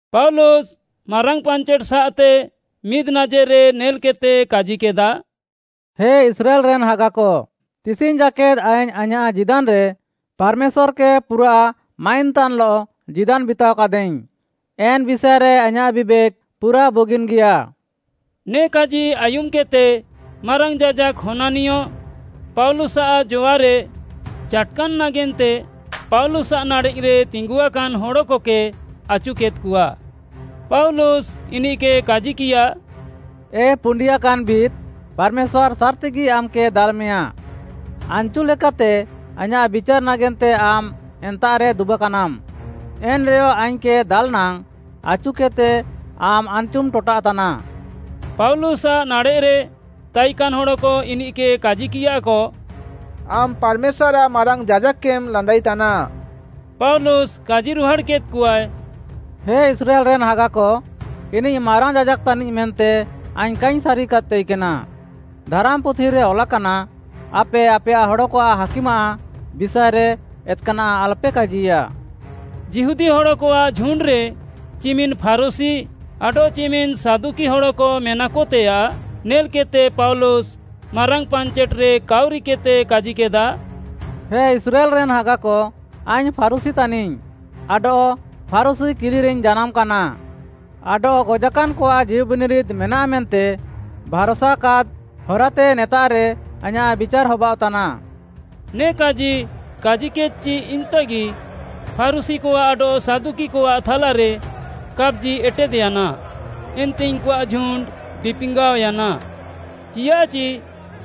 ପାଉଲୁସ୍‌ ମାରାଙ୍ଗ୍‌ ପାଞ୍ଚେଟ୍‌ସାଃତେ ମିଦ୍‌ନାଜେର୍‌ରେ ନେଲ୍‌କେଦ୍‌ତେ କାଜିକେଦା, “ହେ ଇସ୍ରାଏଲ୍‌ରେନ୍‌ ହାଗାକ, ତିସିଙ୍ଗ୍‌ ଜାକେଦ୍‌ ଆଇଙ୍ଗ୍‌ ଆଇଁୟାଃ ଜୀଦାନ୍‌ରେ ପାର୍‌ମେଶ୍ୱାର୍‌କେ ପୁରାଃ ମାଇନ୍‌ତାନ୍‌ଲଃ ଜୀଦାନ୍‌ ବିତାଅକାଦାଇଙ୍ଗ୍‌, ଏନ୍‌ ବିଷାଏରେ ଆଇଁୟାଃ ବିବେକ୍‌ ପୁରା ବୁଗିନ୍‌ଗିୟା।” ନେ କାଜି ଆୟୁମ୍‌କେଦ୍‌ତେ ମାରାଙ୍ଗ୍‌ ଯାଜାକ୍‌ ହନାନିୟ, ପାଉଲୁସ୍‌ଆଃ ଜଆରେ ଚାଟ୍‌କାନ୍‌ ନାଗେନ୍ତେ ପାଉଲୁସ୍‌ଆଃ ନାଡ଼େଃରେ ତିଙ୍ଗୁଆକାନ୍‌ ହଡ଼କକେ ଆଚୁକେଦ୍‌କଆ। ପାଉଲୁସ୍‌ ଇନିଃକେ କାଜିକିୟା, “ଏ ପୁଣ୍ଡିଆକାନ୍‌ ଭିତ୍‌, ପାର୍‌ମେଶ୍ୱାର୍‌ ସାର୍‌ତିଗି ଆମ୍‌କେ ଦାଲ୍‌ମେୟାଁ। ଆନ୍‌ଚୁ ଲେକାତେ ଆଇଁୟାଃ ବିଚାର୍‌ ନାଗେନ୍ତେ ଆମ୍‌ ଏନ୍ତାଃରେ ଦୁବାକାନାମ୍‌, ଏନ୍‌ରେୟ ଆଇଙ୍ଗ୍‌କେ ଦାଲ୍‌ ନାଙ୍ଗ୍‌ ଆଚୁକେଦ୍‌ତେ ଆମ୍‌ ଆନ୍‌ଚୁମ୍‌ ଟଟାଃତାନା।” ପାଉଲୁସ୍‌ଆଃ ନାଡ଼େଃରେ ତାଇକାନ୍‌ ହଡ଼କ ଇନିଃକେ କାଜିକିୟାକ, “ଆମ୍‌ ପାର୍‌ମେଶ୍ୱାର୍‌ଆଃ ମାରାଙ୍ଗ୍‌ ଯାଜାକ୍‌କେମ୍‌ ଲାନ୍ଦାଇତାନା।” ପାଉଲୁସ୍‌ କାଜିରୁହାଡ଼୍‌କେଦ୍‌କଆଏ, “ହେ ଇସ୍ରାଏଲ୍‌ରେନ୍‌ ହାଗାକ, ଇନିଃ ମାରାଙ୍ଗ୍‌ ଯାଜାକ୍‌ ତାନିଃ ମେନ୍ତେ ଆଇଙ୍ଗ୍‌ କାଇଙ୍ଗ୍‌ ସାରିକାଦ୍‌ ତାଇକେନା। ଧାରାମ୍‌ପୁଥିରେ ଅଲାକାନା, ‘ଆପେ ଆପେୟାଃ ହଡ଼କଆଃ ହାକିମ୍‌ଆଃ ବିଷାଏରେ ଏତ୍‌କାନାଃ ଆଲପେ କାଜିୟା।’” ଯିହୁଦୀ ହଡ଼କଆଃ ଝୁଣ୍ଡ୍‌ରେ ଚିମିନ୍‌ ଫାରୁଶୀ ଆଡଃ ଚିମିନ୍ ସାଦୁକି ହଡ଼କ ମେନାକତେୟାଃ ନେଲ୍‌କେଦ୍‌ତେ ପାଉଲୁସ୍‌ ମାରାଙ୍ଗ୍‌ ପାଞ୍ଚେଟ୍‌ରେ କାଉରିକେଦ୍‌ତେ କାଜିକେଦା, “ହେ ଇସ୍ରାଏଲ୍‌ରେନ୍‌ ହାଗାକ, ଆଇଙ୍ଗ୍‌ ଫାରୁଶୀ ତାନିଙ୍ଗ୍‌ ଆଡଃ ଫାରୁଶୀ କିଲିରେଇଙ୍ଗ୍‌ ଜାନାମ୍‌ କାନା। ଆଡଃ ଗଜାକାନ୍‌କଆଃ ଜୀଉବିନିରିଦ୍‌ ମେନାଃ ମେନ୍ତେ ଭାର୍‌ସାକାଦ୍‌ ହରାତେ ନେତାଃରେ ଆଇଁୟାଃ ବିଚାର୍‌ ହବାଅଃତାନା।” ନେ କାଜି କାଜିକେଦ୍‌ଚି ଇମ୍‌ତାଗି, ଫାରୁଶୀକଆଃ ଆଡଃ ସାଦୁକିକଆଃ ଥାଲାରେ କାପ୍‌ଜି ଏଟେଦ୍‌ୟାନା, ଏନ୍ତେ ଇନ୍‌କୁଆଃ ଝୁଣ୍ଡ୍‌ ବିପିଙ୍ଗାଅୟାନା। ଚିଆଃଚି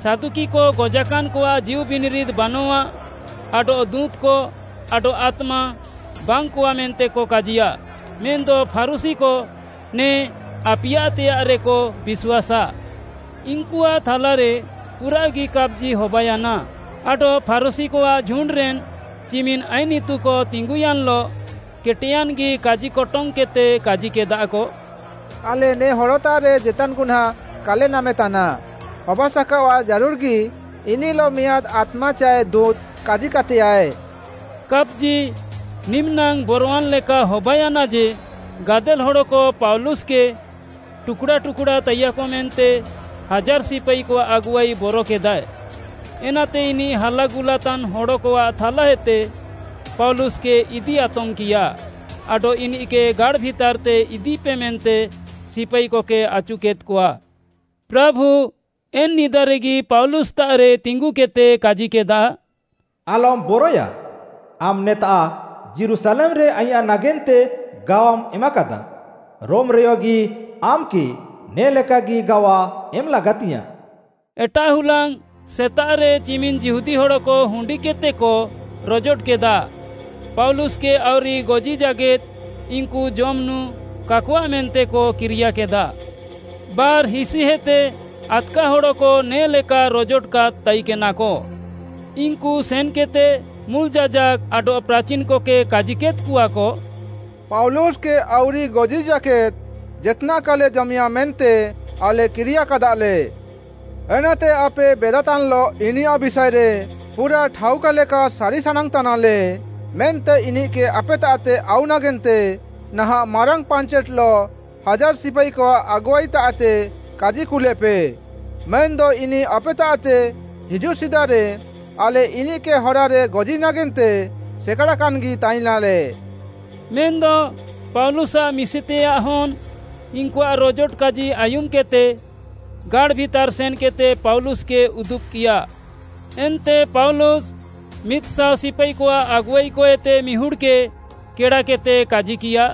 ସାଦୁକିକ ଗଜାକାନ୍‌କଆଃ ଜୀଉବିନିରିଦ୍‌ ବାନଃଆ ଆଡଃ ଦୁଁତ୍‌କ, ଆଡଃ ଆତ୍ମା ବାଙ୍ଗ୍‌କଆ ମେନ୍ତେକ କାଜିୟାଃ, ମେନ୍‌ଦ ଫାରୁଶୀକ ନେ ଆପିୟାତେୟାଃରେକ ବିଶ୍ୱାସାଃ। ଇନ୍‌କୁଆଃ ଥାଲାରେ ପୁରାଃଗି କାପ୍‌ଜି ହବାୟାନା ଆଡଃ ଫାରୁଶୀକଆଃ ଝୁଣ୍ଡ୍‌ରେନ୍‌ ଚିମିନ୍‌ ଆଇନ୍‌ ଇତୁକ ତିଙ୍ଗୁୟାନ୍‌ଲଃ କେଟେୟାନ୍‌ଗି କାଜିକଟଙ୍ଗ୍‌କେଦ୍‌ତେ କାଜିକେଦାକ, “ଆଲେ ନେ ହଡ଼ତାଃରେ ଜେତାନ୍‌ ଗୁହ୍ନାଁଁ କାଲେ ନାମେତାନା, ହବାସାକାଅଆଃ ଜାରୁଡ଼୍‌ଗି ଇନିଃଲଃ ମିଆଁଦ୍‌ ଆତ୍ମା ଚାଏ ଦୁଁତ୍‌ କାଜିକାତେୟାଃଏ।” କାପ୍‌ଜି ନିମିନାଙ୍ଗ୍‌ ବରୱାନ୍‌ ଲେକା ହବାୟାନା ଯେ, ଗାଦେଲ୍‌ ହଡ଼କ ପାଉଲୁସ୍‌କେ ଟୁକ୍‌ଡ଼ା ଟୁକ୍‌ଡ଼ା ତାଇୟାକ ମେନ୍ତେ ହାଜାର୍‌ ସିପାଇକଆଃ ଆଗୁଆଇ ବରକେଦାଏ। ଏନାତେ ଇନିଃ ହାଲାଗୁଲାତାନ୍‌ ହଡ଼କଆଃ ଥାଲାଏତେ ପାଉଲୁସ୍‌କେ ଇଦି ଆତମ୍‌କିୟା ଆଡଃ ଇନିଃକେ ଗାଡ଼୍‌ ଭିତାର୍‌ତେ ଇଦିପେ ମେନ୍ତେ ସିପାଇକକେ ଆଚୁକେଦ୍‌କଆ। ପ୍ରାଭୁ ଏନ୍‌ ନିଦାରେଗି ପାଉଲୁସ୍‌ତାଃରେ ତିଙ୍ଗୁକେଦ୍‌ତେ କାଜିକେଦା, “ଆଲମ୍‌ ବରଏୟା, ଆମ୍‌ ନେତାଃ ଯୀରୁଶାଲେମ୍‌ରେ ଆଇଁୟାଃ ନାଗେନ୍ତେ ଗାୱାମ୍‌ ଏମାକାଦା। ରୋମ୍‌ରେୟଗି ଆମ୍‌କେ ନେ'ଲେକାଗି ଗାୱା ଏମ୍‌ ଲାଗାତିୟାଁ।” ଏଟାଃ ହୁଲାଙ୍ଗ୍‌ ସେତାଃରେ ଚିମିନ୍‌ ଯିହୁଦୀ ହଡ଼କ ହୁଣ୍ଡିକେଦ୍‌ତେକ ରୋଜୋଟକେଦା। ପାଉଲୁସ୍‌କେ ଆଉରି ଗଜି ଜାକେଦ୍‌ ଇନ୍‌କୁ ଜମ୍‌ ନୁଁ କାକଆଃ ମେନ୍ତେକ କିରିୟାକେଦା। ବାର୍‌ହିସିହେତେ ଆଦ୍‌କା ହଡ଼କ ନେ'ଲେକା ରୋଜୋଟକାଦ୍‌ ତାଇକେନାକ। ଇନ୍‌କୁ ସେନ୍‌କେଦ୍‌ତେ ମୁଲ୍‌ ଯାଜାକ୍‌ ଆଡଃ ପ୍ରାଚିନ୍‌କକେ କାଜିକେଦ୍‌କଆକ, “ପାଉଲୁସ୍‌କେ ଆଉରି ଗଜି ଜାକେଦ୍‌ ଜେତ୍‌ନାଃ କାଲେ ଜମେୟାଁ ମେନ୍ତେ ଆଲେ କିରିୟାକାଦାଲେ। ଏନାତେ ଆପେ ବେଦାତାନ୍‌ଲଃ ଇନିୟାଃ ବିଷାଏରେ ପୁରାଃ ଠାଉକାଲେକା ସାରି ସାନାଙ୍ଗ୍‌ତାନାଲେ ମେନ୍ତେ ଇନିଃକେ ଆପେତାଃତେ ଆଉ ନାଗେନ୍ତେ ନାହାଁଃ ମାରାଙ୍ଗ୍‌ ପାଞ୍ଚେଟ୍‌ଲଃ ହାଜାର୍‌ ସିପାଇକଆଃ ଆଗୁଆଇତାଃତେ କାଜି କୁଲେପେ। ମେନ୍‌ଦ ଇନିଃ ଆପେତାଃତେ ହିଜୁଃ ସିଦାରେ ଆଲେ ଇନିଃକେ ହରାରେ ଗଜି ନାଗେନ୍ତେ ସେକାଡ଼ାକାନ୍‌ଗି ତାଇନାଲେ।” ମେନ୍‌ଦ ପାଉଲୁସ୍‍ଆଃ ମିଶିତେୟାଃ ହନ୍‌ ଇନ୍‌କୁଆଃ ରୋଜୋଟ କାଜି ଆୟୁମ୍‌କେଦ୍‌ତେ ଗାଡ଼୍‌ ଭିତାର୍‌ ସେନ୍‌କେଦ୍‌ତେ ପାଉଲୁସ୍‌କେ ଉଦୁବ୍‌କିୟା। ଏନ୍ତେ ପାଉଲୁସ୍‌ ମିଦ୍‌ଶାଅ ସିପାଇକଆଃ ଆଗୁଆଇକଏତେ ମିହୁଡ଼୍‌କେ କେଡ଼ାକେଦ୍‌ତେ କାଜିକିୟା,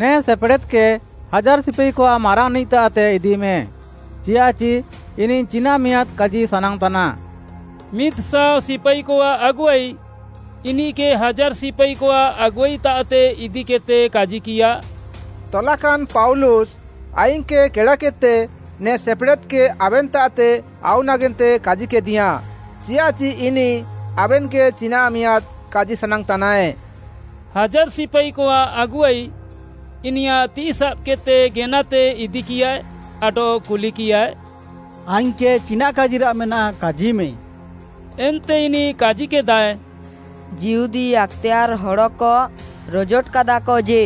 “ନେ ସେପେଡ଼େଦ୍‌କେ ହାଜାର୍‍ ସିପାଇକଆଃ ମାରାଙ୍ଗ୍‌ନିଃତାଃତେ ଇଦିମେ, ଚିଆଃଚି ଇନିଃ ଚିନାଃ ମିଆଁଦ୍‌ କାଜି ସାନାଙ୍ଗ୍‌ତାନାଏ।” ମିଦ୍‌ଶାଅ ସିପାଇକଆଃ ଆଗୁଆଇ ଇନିଃକେ ହାଜାର୍‌ ସିପାଇକଆଃ ଆଗୁଆଇତାଃତେ ଇଦିକେଦ୍‌ତେ କାଜିକିୟା, “ତଲାକାନ୍‌ ପାଉଲୁସ୍‌ ଆଇଙ୍ଗ୍‌କେ କେଡ଼ାକେଦ୍‌ତେ ନେ ସେପେଡ଼େଦ୍‌କେ ଆବେନ୍‌ତାଃତେ ଆଉ ନାଗେନ୍ତେ କାଜିକେଦିୟାଁ, ଚିଆଃଚି ଇନିଃ ଆବେନ୍‌କେ ଚିନାଃ ମିଆଁଦ୍‌ କାଜି ସାନାଙ୍ଗ୍‌ତାନାଏ।” ହାଜାର୍‍ ସିପାଇକଆଃ ଆଗୁଆଇ ଇନିୟାଃ ତିଃଇ ସାବ୍‌କେଦ୍‌ତେ ଗେନାତେ ଇଦିକିୟାଏ ଆଡଃ କୁଲିକିୟାଏ, “ଆଇଙ୍ଗ୍‌କେ ଚିନାଃ କାଜିରାଃ ମେନାଃ, କାଜିମେ?” ଏନ୍ତେ ଇନିଃ କାଜିକେଦାଏ, “ଯିହୁଦୀ ଆକ୍‌ତେୟାର୍‌ ହଡ଼କ ରୋଜୋଟକାଦାକ ଯେ,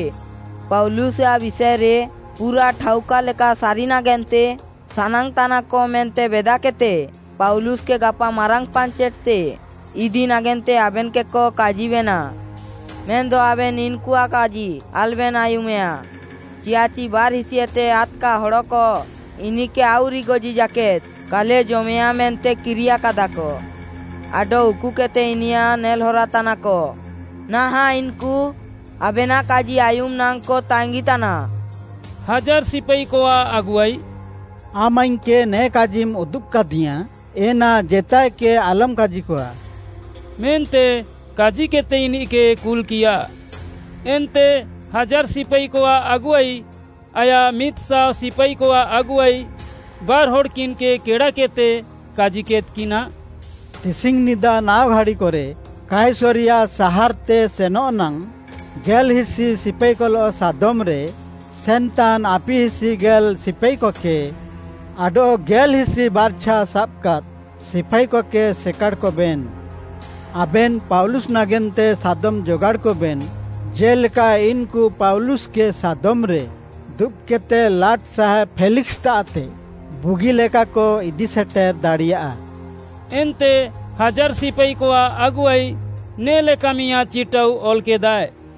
ପାଉଲୁସ୍‌ଆଃ ବିଷାଏରେ ପୁରାଃ ଠାଉକାଲେକା ସାରି ନାଗେନ୍ତେ ସାନାଙ୍ଗ୍‌ତାନାକ ମେନ୍ତେ ବେଦାକେଦ୍‌ତେ, ପାଉଲୁସ୍‌କେ ଗାପା ମାରାଙ୍ଗ୍‌ ପାଞ୍ଚେଟ୍‌ତେ ଇଦି ନାଗେନ୍ତେ ଆବେନ୍‌କେକ କାଜିବେନା। ମେନ୍‌ଦ ଆବେନ୍‌ ଇନ୍‌କୁଆଃ କାଜି ଆଲବେନ୍‌ ଆୟୁମେୟା, ଚିଆଃଚି ବାର୍‌ହିସିହେତେ ଆଦ୍‌କା ହଡ଼କ ଇନିଃକେ ଆଉରି ଗଜି ଜାକେଦ୍‌ କାଲେ ଜମେୟାଁ ମେନ୍ତେ କିରିୟାକାଦାକ ଆଡଃ ଉକୁକେଦ୍‌ତେ ଇନିୟାଃ ନେଲ୍‌ହରାତାନାକ। ନାହାଁଃ ଇନ୍‌କୁ ଆବେନାଃ କାଜି ଆୟୁମ୍‌ ନାଙ୍ଗ୍‌କ ତାଙ୍ଗିତାନା।” ହାଜାର୍‌ ସିପାଇକଆଃ ଆଗୁଆଇ “ଆମ୍‌ ଆଇଙ୍ଗ୍‌କେ ନେ କାଜିମ୍‌ ଉଦୁବ୍‌କାଦିୟାଁ ଏନା ଜେତାଏକେ ଆଲମ୍‌ କାଜିକଆ।” ମେନ୍ତେ କାଜିକେଦ୍‌ତେ ଇନିଃକେ କୁଲ୍‌କିୟା। ଏନ୍ତେ ହାଜାର୍‌ ସିପାଇକଆଃ ଆଗୁଆଇ ଆୟାଃ ମିଦ୍‌ଶାଅ ସିପାଇକଆଃ ଆଗୁଆଇ, ବାର୍‌ହଡ଼୍‌କିନ୍‌କେ କେଡ଼ାକେଦ୍‌ତେ କାଜିକେଦ୍‌କିନା, “ତିସିଙ୍ଗ୍‌ନିଦା ନାଅ ଘାଡ଼ିକରେ କାଇସରିୟା ସାହାର୍‌ତେ ସେନଃ ନାଙ୍ଗ୍‌ ଗେଲ୍‌ହିସି ସିପାଇକଲଃ ସାଦମ୍‌ରେ ସେନ୍‌ତାନ୍‌ ଆପିହିସି ଗେଲ୍‌ ସିପାଇକକେ ଆଡଃ ଗେଲ୍‌ହିସି ବାର୍ଛା ସାବାକାଦ୍‌ ସିପାଇକକେ ସେକାଡ଼୍‌କବେନ୍‌। ଆବେନ୍‌ ପାଉଲୁସ୍‌ ନାଗେନ୍ତେ ସାଦମ୍‌ ଜଗାଡ଼୍‌କବେନ୍‌ ଜେ'ଲେକା ଇନ୍‌କୁ ପାଉଲୁସ୍‌କେ ସାଦମ୍‌ରେ ଦୁବ୍‌କେଦ୍‌ତେ ଲାଟ୍‌ସାହେବ୍‌ ଫେଲିକ୍‌ସ୍‌ତାଃତେ ବୁଗିଲେକାକ ଇଦିସେଟେର୍‌ ଦାଡ଼ିୟା।” ଏନ୍ତେ ହାଜାର୍‌ ସିପାଇକଆଃ ଆଗୁଆଇ ନେ'ଲେକା ମିଆଁଦ୍‌ ଚିଟାଉ ଅଲ୍‌କେଦାଏ।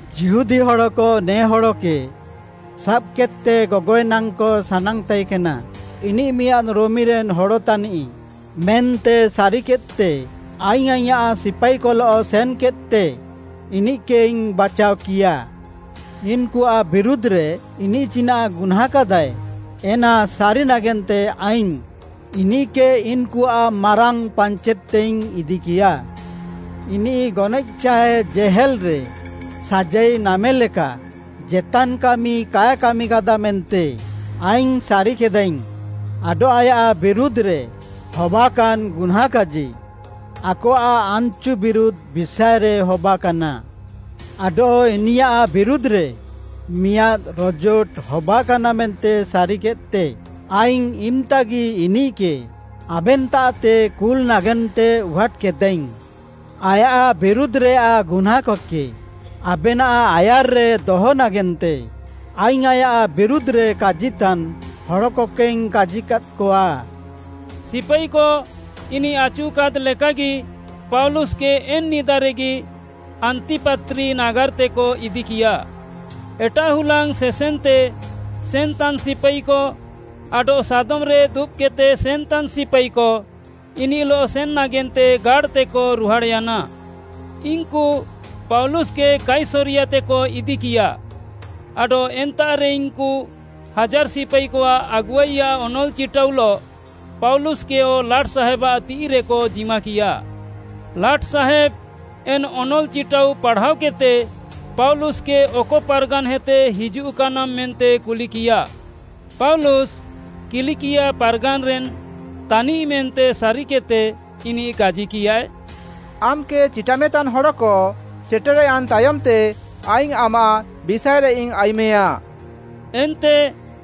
ଯିହୁଦୀ ହଡ଼କ ନେ ହଡ଼କେ ସାବ୍‌କେଦ୍‌ତେ ଗଗଏଃ ନାଙ୍ଗ୍‌କ ସାନାଙ୍ଗ୍‌ ତାଇକେନା। ଇନିଃ ମିଆଁଦ୍‌ ରୋମିରେନ୍‌ ହଡ଼ ତାନିଃ ମେନ୍ତେ ସାରିକେଦ୍‌ତେ ଆଇଙ୍ଗ୍‌ ଆଇଁୟାଃ ସିପାଇକଲଃ ସେନ୍‌କେଦ୍‌ତେ ଇନିଃକେଇଙ୍ଗ୍‌ ବାଚାଅକିୟା। ଇନ୍‌କୁଆଃ ବିରୁଧ୍‌ରେ ଇନିଃ ଚିନାଃ ଗୁହ୍ନାଁଁକାଦାଏ, ଏନା ସାରି ନାଗେନ୍ତେ ଆଇଙ୍ଗ୍‌ ଇନିଃକେ ଇନ୍‌କୁଆଃ ମାରାଙ୍ଗ୍‌ ପାଞ୍ଚେଟ୍‌ତେଇଙ୍ଗ୍‌ ଇଦିକିୟା। ମେନ୍‌ଦ ଇନିଃ ଗନଏଃ ଚାଏ ଜେହେଲ୍‌ରେ ସାଜାଇ ନାମେ ଲେକା ଜେତାନ୍‌ କାମି କାଏ କାମିକାଦା ମେନ୍ତେ ଆଇଙ୍ଗ୍‌ ସାରିକେଦାଇଙ୍ଗ୍‌। ଆଡଃ ଆୟାଃ ବିରୁଧ୍‌ରେ ହବାକାନ୍‌ ଗୁହ୍ନାଁଁ କାଜି ଆକଆଃ ଆନ୍‌ଚୁ ବିରୁଧ୍‌ ବିଷାଏରେ ହବାକାନା। ଆଡଃ ଇନିୟାଃ ବିରୁଧ୍‌ରେ ମିଆଁଦ୍‌ ରୋଜୋଟ ହବାକାନା ମେନ୍ତେ ସାରିକେଦ୍‌ତେ ଆଇଙ୍ଗ୍‌ ଇମ୍‌ତାଗି ଇନିଃକେ ଆବେନ୍‌ତାଃତେ କୁଲ୍‌ ନାଗେନ୍ତେଇଙ୍ଗ୍‌ ଉହାଟ୍‌କେଦା। ଆୟାଃ ବିରୁଧ୍‌ରେୟାଃ ଗୁହ୍ନାଁଁକକେ ଆବେନାଃ ଆୟାର୍‌ରେ ଦହ ନାଗେନ୍ତେ ଆଇଙ୍ଗ୍‌ ଆୟାଃ ବିରୁଧ୍‌ରେ କାଜିତାନ୍‌ ହଡ଼କକେଇଙ୍ଗ୍‌ କାଜିକାଦ୍‌କଆ।” ସିପାଇକ ଇନିଃ ଆଚୁକାଦ୍‌ ଲେକାଗି ପାଉଲୁସ୍‌କେ ଏନ୍‌ ନିଦାରେଗି ଆନ୍ତିପାତ୍ରି ନାଗାର୍‌ତେକ ଇଦିକିୟା। ଏଟାଃ ହୁଲାଙ୍ଗ୍‌ ସେସେନ୍‌ତେ ସେନ୍‌ତାନ୍‌ ସିପାଇକ ଆଡଃ ସାଦମ୍‌ରେ ଦୁବ୍‌କେଦ୍‌ତେ ସେନ୍‌ତାନ୍‌ ସିପାଇକ ଇନିଃଲଃ ସେନ୍‌ ନାଗେନ୍ତେ ଗାଡ଼୍‌ତେକ ରୁହାଡ଼୍‌ୟାନା। ଇନ୍‌କୁ ପାଉଲୁସ୍‌କେ କାଇସରିୟାତେକ ଇଦିକିୟା, ଆଡଃ ଏନ୍ତାଃରେ ଇନ୍‌କୁ ହାଜାର୍‌ ସିପାଇକଆଃ ଆଗୁଆଇଆଃ ଅନଲ୍‌ ଚିଟାଉଲଃ ପାଉଲୁସ୍‌କେୟ ଲାଟ୍‌ସାହେବ୍‌ଆଃ ତିଃଇରେକ ଜିମାକିୟା। ଲାଟ୍‌ସାହେବ୍‌ ଏନ୍‌ ଅନଲ୍‌ ଚିଟାଉ ପାଢ଼ାଅକେଦ୍‌ତେ ପାଉଲୁସ୍‌କେ ଅକ ପାର୍‌ଗାନ୍‌ହେତେ ହିଜୁଃକାନାମ୍‌ ମେନ୍ତେ କୁଲିକିୟା। ପାଉଲୁସ୍‌ କିଲିକିଆ ପାର୍‌ଗାନ୍‌ରେନ୍‌ ତାନିଃ ମେନ୍ତେ ସାରିକେଦ୍‌ତେ, ଇନିଃ କାଜିକିୟାଏ, “ଆମ୍‌କେ ଚିଟାମେତାନ୍‌ ହଡ଼କ ସେଟେର୍‌ୟାନ୍‌ ତାୟମ୍‌ତେ ଆଇଙ୍ଗ୍‌ ଆମାଃ ବିଷାଏରେଇଙ୍ଗ୍‌ ଆୟୁମେୟାଁ।” ଏନ୍ତେ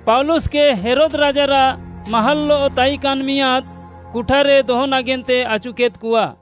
ପାଉଲୁସ୍‌କେ ହେରୋଦ୍‌ ରାଜାରାଃ ମାହାଲ୍‌ଲଃ ତାଇକାନ୍‌ ମିଆଁଦ୍‌ କୁଠାରେ ଦହ ନାଗେନ୍ତେ ଆଚୁକେଦ୍‌କଆ।